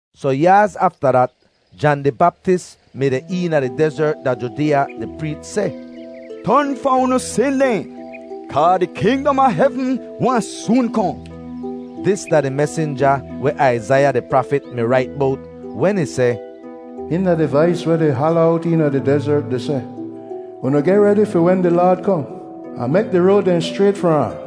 Sohn yaaz afta dat, Jan di Baptis mi deh eena di dezert da Judeeya di preech seh, “Ton fahn unu sin dehn, kaa di kingdom a hevn wahn soon kohn.” Dis da di mesinja weh Aizaiya di prafit mi rait bowt wen ih seh, “Hihn da di vais weh di hala owt eena di dezert di seh, ‘Unu geh redi fi wen di Laad kohn, ahn mek di road dehn schrayt far ahn.’”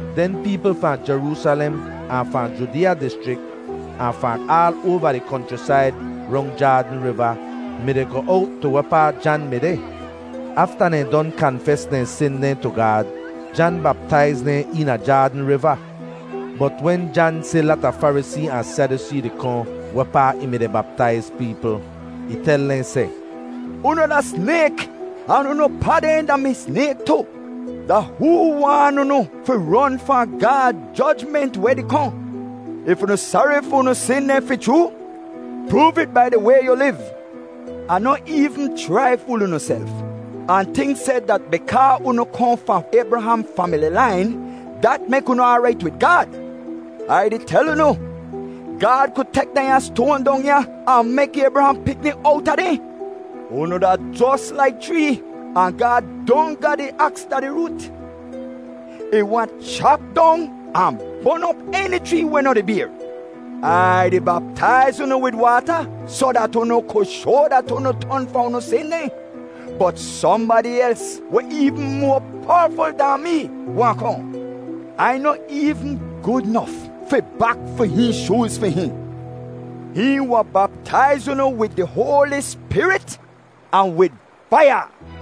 Den peepl fahn Jeroosalem ahn fahn Judeeya dischrik, ahn fahn aal oava di konchrisaid rong Jaadn Riva mi-di goh owt tu wehpaa Jan mi deh. Afta dehn don kanfes dehn sin dehn tu Gaad, Jan baptaiz dehn eena Jaadn Riva. Bot wen Jan si lata Farisee ahn Sadyusee di kohn wehpaa ih mi-di baptaiz peepl, ih tel dehn seh, “Unu da snayk ahn unu pa dehn da-mi snayk tu! Da hoo waan unu fi ron fahn Gaad jojment weh di kohn? If unu sari fi unu sin dehn fi chroo, proov it bai di way yu liv. Ahn noh eevn chrai fool unuself ahn tink seh dat bikaa unu kohn fahn Aybraham famili lain, dat mek unu aarait wid Gaad. Ai di tel unu, Gaad ku tek dehnya stoan dong ya ahn mek Aybraham pikni owta dehn. Unu da jos laik chree, ahn Gaad don ga di aks da di root. Ih wahn chap dong ahn bon op eni chree weh noh di bayr. “Ai di baptaiz unu wid waata soh dat unu ku shoa dat unu ton fahn unu sin dehn, bot sohnbadi els weh eevn moa powaful dahn mee wahn kohn. Ai noh eevn gud nof fi bak fi hihn shooz fi hihn. Hihn wahn baptaiz unu wid di Hoali Spirit ahn wid faiya.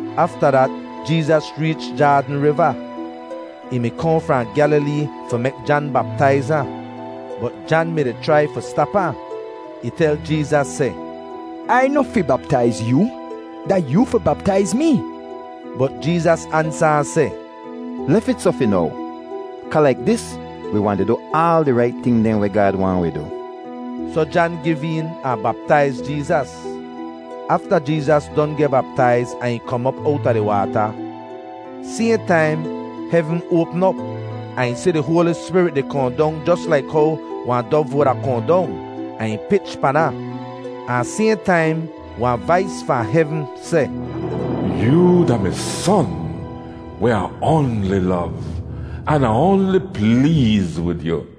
Afta dat Jeezas reech Jaadn Riva. Ih mi kohn fahn Gyalilee fi mek Jan baptaiz ahn. Bot Jan mi-di chrai fi stap ahn. Ih tel Jeezas seh, “Ai noh fi baptaiz yoo; da yoo fi baptaiz mee!” Bot Jeezas ansa ahn seh, “Lef it soh fi now, kaa laik dis wi wahn di du aal di rait ting dehn weh Gaad waahn wi du.” Soh Jan giv een ahn baptaiz Jeezas. Afta Jeezas don geh baptaiz ahn ih kom op owta di waata, sayhn taim hevn oapm op ahn ih si di Hoali Spirit di kohn dong jos laik how wahn dov wuda kohn dong, ahn ih pich pan ahn. Ahn sayhn taim wahn vais fahn hevn seh, “Yoo da mi Son weh Ah oanli lov, an Ah oanli pleez wid yu.”